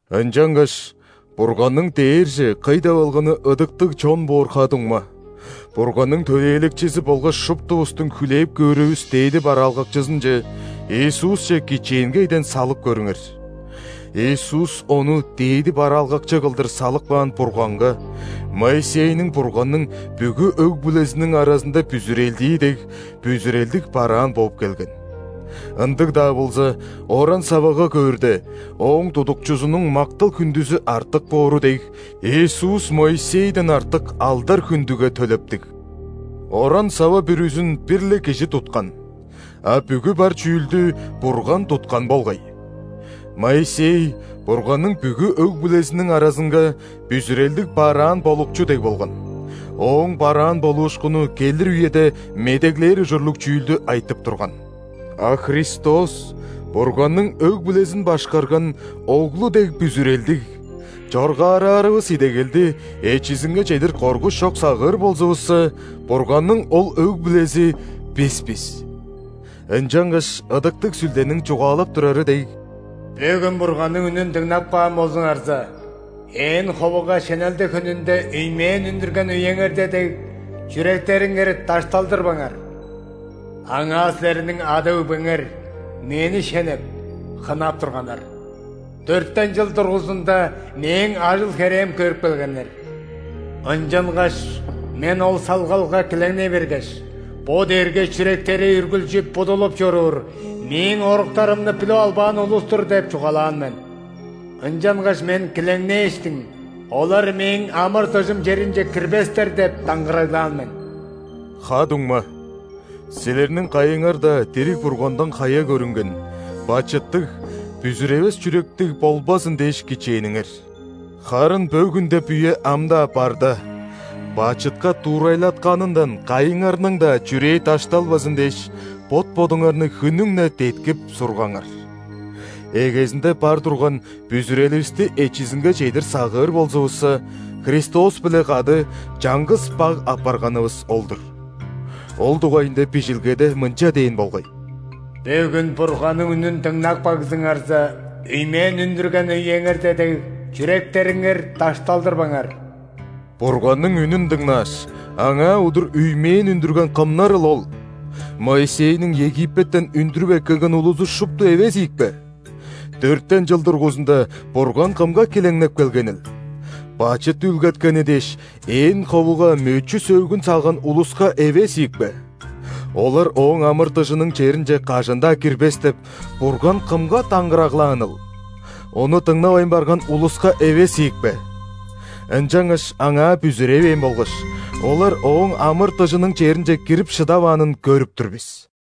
Ынчангаш, Бурганның дээрже кый деп алганы ыдыктыг чон боор ха-дуңма, Бурганның Төлээлекчизи болгаш шуптувустуң хүлээп көөрүвүс дээди бараалгакчызынче – Иисусче кичээнгейден салып көрүңер. Иисус Ону дээди бараалгакчы кылдыр салып каан Бурганга, Моисейниң Бурганның бүгү өг-бүлезиниң аразында бүзүрелдии дег, бүзүрелдиг бараан бооп келген. Ындыг-даа болза, оран-савагаR көөрде, ооң тудукчузунуң мактал-хүндүзү артык боору дег, Иисус Моисейден артык алдар-хүндүге төлептиг. Оран-сава бүрүзүн бир-ле кижи туткан, а бүгү бар чүүлдү Бурган туткан болгай. Моисей Бурганның бүгү өг-бүлезиниң аразынга бүзүрелдиг бараан болукчу дег болган, ооң бараан болуушкуну келир үеде медеглээр ужурлуг чүүлдү айтып турган. А Христос Бурганның өг-бүлезин башкарган Оглу дег бүзүрелдиг! Чоргаараарывыс идегелди эчизинге чедир коргуш чок сагыыр болзувусса, Бурганның ол өг-бүлези – бис бис. Ынчангаш Ыдыктыг Сүлдениң чугаалап турары дег:«Бөгүн, Бурганның үнүн дыңнап каан болзуңарза, ээн ховуга шенелде хүнүнде үймээн үндүрген үеңерде дег,чүректериңер дашталдырбаңар. Аңаа силерниң ада-өгбеңер Мени шенеп, хынап турганнар,дөртен чыл дургузунда Мээң ажыл-херээм көрүп келгеннер. Ынчангаш Мен ол салгалга килеңней бергеш:„Бо дээрге чүректери үргүлчү будулуп чоруур,Мээң оруктарымны билип албаан улус-тур“ – деп чугаалаан мен. Ынчангаш Мен килеңнээштиң:„Олар Мээң амыр-дыжым черинче кирбестер“ – деп даңгыраглаан мен». Ха-дуңма, силерниң кайыңар-даа дириг Бургандан хая көрүнген, бачыттыг, бүзүревес чүректиг болбазын дээш, кичээниңер. Харын «бөгүн» деп үе ам-даа барда, бачытка дуурайлатканындан кайыңарның-даа чүрээ дашталбазын дээш, бот-бодуңарны хүннүң-не деткип, сургаңар. Эгезинде бар турган бүзүреливисти эчизинге чедир сагыыр болзувусса, Христос-биле кады чаңгыс баг апарганывыс ол-дур. Ол дугайында Бижилгеде мынча дээн болгай: «Бөгүн, Бурганның үнүн дыңнап кагзыңарза, үймээн үндүрген үеңерде дег, чүректериңер дашталдырбаңар». Бурганның үнүн дыңнааш, Аңаа удур үймээн үндүрген кымнарыл ол? Моисейниң Египеттен үндүрүп эккелген улузу шупту эвес ийикпе? Дөртен чыл дургузунда Бурган кымга килеңнеп келгенил? Бачыт үүлгеткени дээш, ээн ховуга мөчү-сөөгүн салган улуска эвес ийикпе? Олар Ооң амыр-дыжының черинче кажан-даа кирбес деп, Бурган кымга даңгыраглааныл? Ону дыңнавайн барган улуска эвес ийикпе? Ынчангаш Аңаа бүзүревээн болгаш, олар Ооң амыр-дыжының черинче кирип шыдаваанын көрүп тур бис.